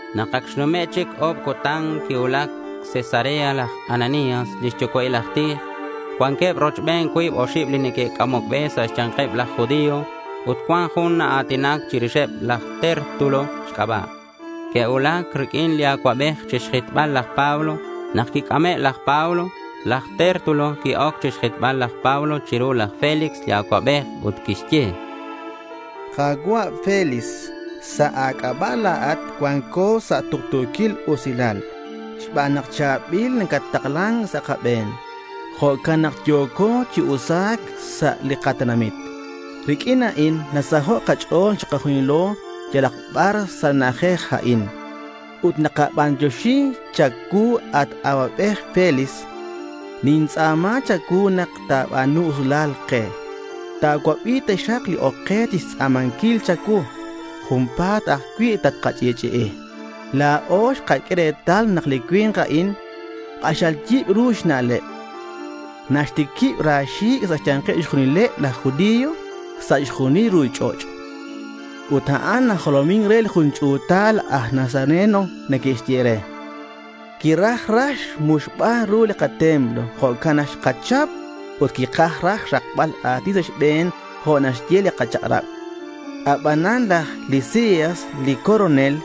Nak ac xnume' chic o̱b cutan, quicuulac Cesarea laj Ananías li xyucua'il aj tij. Cuanqueb rochben cuib oxib li neque'c'amoc be sa' xya̱nkeb laj judío, ut cuan jun naa̱tinac chirixeb, aj Tértulo xc'aba'. Que'cuulac riq'uin li acuabej chixjitbal laj Pablo. Nak quic'ame' laj Pablo, laj Tértulo qui-oc chixjitbal laj Pablo chiru laj Félix li acuabej ut quixye: —Ka̱cua' Félix, sa' a̱c'aba' la̱at cuanco sa' tuktu̱quil usilal. Xban nak cha̱bil nacattaklan sa' kabe̱n, jo'can nak yo̱co chi usa̱c sa' li katenamit. Riq'uin a'in nasaho' kach'o̱l chikajunilo yalak bar sa' li na'ajej a'in. Ut nakabantioxi cha̱cuu, at acuabej Félix. Nintz'a̱ma cha̱cuu nak ta̱ba̱nu usilal ke. Ta̱cuabi taxak li oc ke chixtz'a̱manquil cha̱cuu. Junpa̱t ajcui' tatkach'i'ch'i'i. La̱o xkaq'ue retal nak li cui̱nk a'in k'axal yibru xna'leb. Naxtiquib ra xi̱c' sa' xya̱nkeb chixjunileb laj judío sa' chixjunil li ruchich'och'. Ut a'an najolomin re li jun ch'u̱tal aj Nazareno neque'xye re. Quiraj raj xmuxbal ru li katemplo. Jo'can nak xkachap, ut quikaj raj xrakbal a̱tin sa' xbe̱n jo' naxye li kachak'rab. Abanan laj Lisias li coronel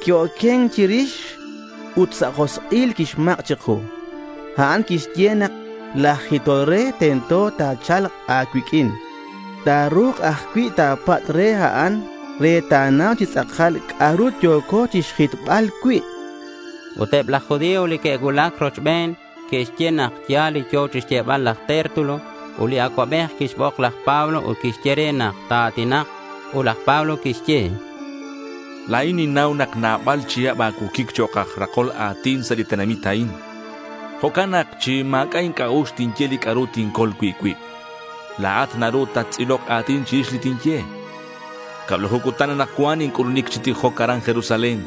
qui-oquen chirix ut sa' josk'il quixmak' chiku. A'an quixye nak laj jitol re tento te'cha̱lk a̱cuiq'uin. Ta̱ru̱k ajcui' ta̱patz' re a'an re ta̱nau chi tz'akal li c'a'ru yo̱co chixjitbal cui', chan. Ut eb laj judío li que'cuulac rochben, que'xye nak ya̱l li yo̱ chixyebal laj Tértulo. Ut li acuabej quixbok laj Pablo ut quixye re nak ta̱a̱tinak. Ut laj Pablo quixye: —La̱in ninnau nak nabal chihab a̱cuoquic chok' aj rakol a̱tin sa' li tenamit a'in. Jo'can nak chi ma̱c'a' inc'a'ux tinye li c'a'ru tincol cui' cuib. La̱at naru tattz'ilok a̱tin chirix li tinye. Cablaju cutan anakcuan inc'ulunic chi tijoc aran Jerusalén.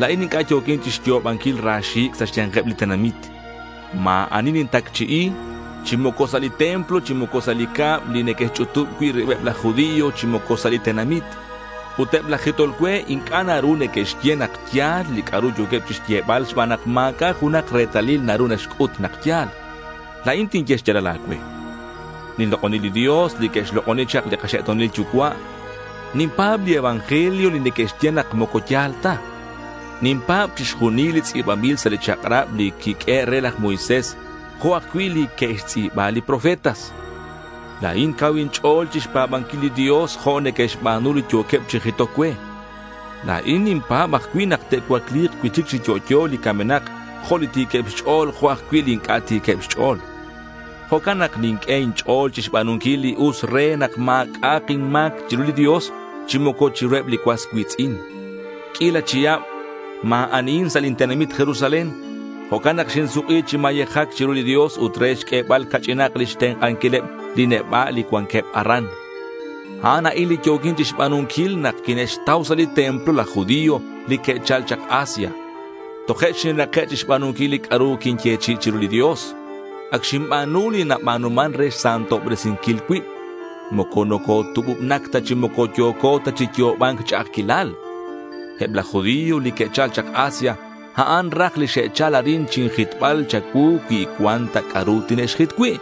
La̱in inc'a' yo̱quin chixyo'obanquil ra xi̱c' sa' xya̱nkeb li tenamit. Ma̱ ani nintacchi'i, chi moco sa' li templo, chi moco sa' li cab li neque'xch'utub cui' ribeb laj judío, chi moco sa' li tenamit. Ut eb laj jitol cue inc'a' naru neque'xye nak ya̱l li c'a'ru yo̱queb chixyebal xban nak ma̱c'a' junak retalil naru naxc'ut nak ya̱l. La̱in tinye xya̱lal a̱cue. Ninlok'oni li Dios li que'xlok'oni chak li kaxe'to̱nil yucua'. Ninpa̱b li evangelio li neque'xye nak moco ya̱l ta. Ninpa̱b chixjunil li tz'i̱banbil sa' li chak'rab li quiq'uehe' re laj Moisés, jo' ajcui' li que'xtz'i̱ba li profetas. La̱in cau inch'o̱l chixpa̱banquil li Dios jo' neque'xba̱nu li yo̱queb chi jitoc cue. La̱in ninpa̱b ajcui' nak te'cuacli̱k cui'chic chi yo'yo li camenak, jo' li ti̱queb xch'o̱l jo' ajcui' li inc'a' ti̱queb xch'o̱l. Jo'can nak ninq'ue inch'o̱l chixba̱nunquil li us re nak ma̱c'a'ak inma̱c chiru li Dios chi moco chiruheb li cuas cui̱tz'in. Q'uila chihab ma̱ anihin sa' lin tenamit Jerusalén. Jo'can nak xinsuk'i chi mayejac chiru li Dios ut re xq'uebal ca'ch'inak lix tenk'anquileb li neba' li cuanqueb aran. A'an a'in li yo̱quin chixba̱nunquil nak quine'xtau sa' li templo laj judío li que'chal chak Asia. Toje' xinrake' xba̱nunquil li c'a'ru quinyechi'i chiru li Dios. Ac xinba̱nu li naba̱numan re xsantobresinquil cuib. Moco nocotububnac ta chi moco yo̱co ta chi yo'oba̱nc ch'a'ajquilal. Eb laj judío li que'chal chak Asia, a'aneb raj li xe'chal arin chinjitbal cha̱cuu cui cuan ta c'a'ru tine'xjit cui'.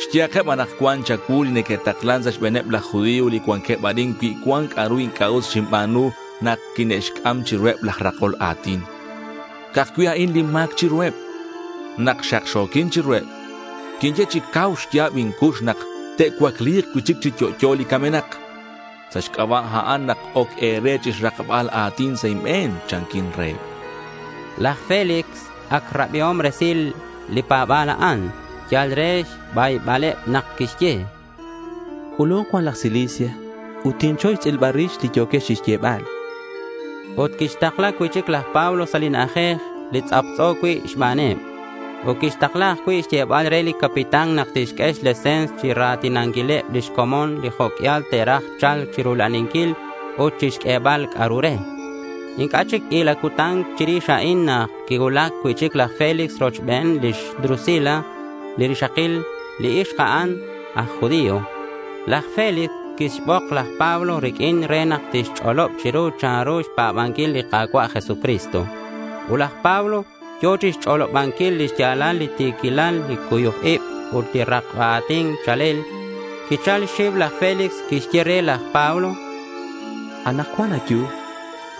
Xyehakeb anakcuan cha̱cuu li neque'taklan sa' xbe̱neb laj judío li cuanqueb arin cui cuan c'a'ru inc'a' us xinba̱nu nak quine'xc'am chiruheb laj rakol a̱tin. Ca'aj cui' a'in lin ma̱c chiruheb: Nak xakxo̱quin chiruheb, quinye chi cau xya̱b incux nak te'cuacli̱k cui'chic chi yo'yo li camenak. Sa' xc'aba' a'an nak oc e̱re chixrakbal a̱tin sa' inbe̱n, chanquin reheb, chan laj Pablo. Laj Félix ac rabiom resil li pa̱ba̱l a'an. Yal re xbaybaleb nak quixye: —C'ulu̱nk cuan laj Lisias ut tinchoy xtz'ilbal rix li yo̱quex chixyebal, chan. Ut quixtakla cui'chic laj Pablo sa' li na'ajej li tz'aptz'o cui' xbaneb. Ut quixtakla ajcui' xyebal re li capitán nak tixq'ue xlese̱ns chira̱tinanquileb lix comon li jo' q'uial te'raj cha̱lc chirula'aninquil ut chixq'uebal c'a'ru re. Inc'a' chic q'uila cutan chirix a'in nak quicuulac cui'chic laj Félix rochben lix Drusila li rixakil. Li ixk a'an aj judío. Laj Félix quixbok laj Pablo riq'uin re nak tixch'olob chiru chanru xpa̱banquil li Ka̱cua' Jesucristo. Ut nak laj Pablo yo̱ chixch'olobanquil lix ya̱lal li ti̱quilal, li cuyuc ib, ut li rakba a̱tin cha̱lel, quichal xxiu laj Félix. Quixye re laj Pablo. —Anakcuan ayu.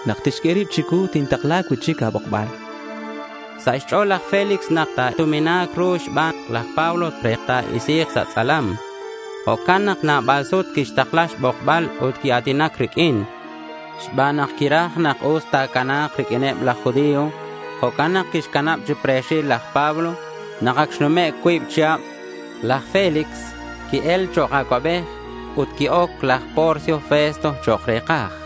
Nak tixq'ue rib chicuu tintakla cui'chic a̱bokbal, chan. Sa' xch'o̱l laj Félix nak ta̱tumina̱k ru xban laj Pablo re ta̱isi̱k sa' tz'alam. Jo'can nak nabal sut quixtakla xbokbal ut quia̱tinac riq'uin. Xban nak quiraj nak us ta̱cana̱k riq'uineb laj judío, jo'can nak quixcanab chi pre̱xil laj Pablo. Nak ac xnume' cuib chihab, laj Félix qui-el chok' acuabej ut qui-oc laj Porcio Festo chok' re̱kaj.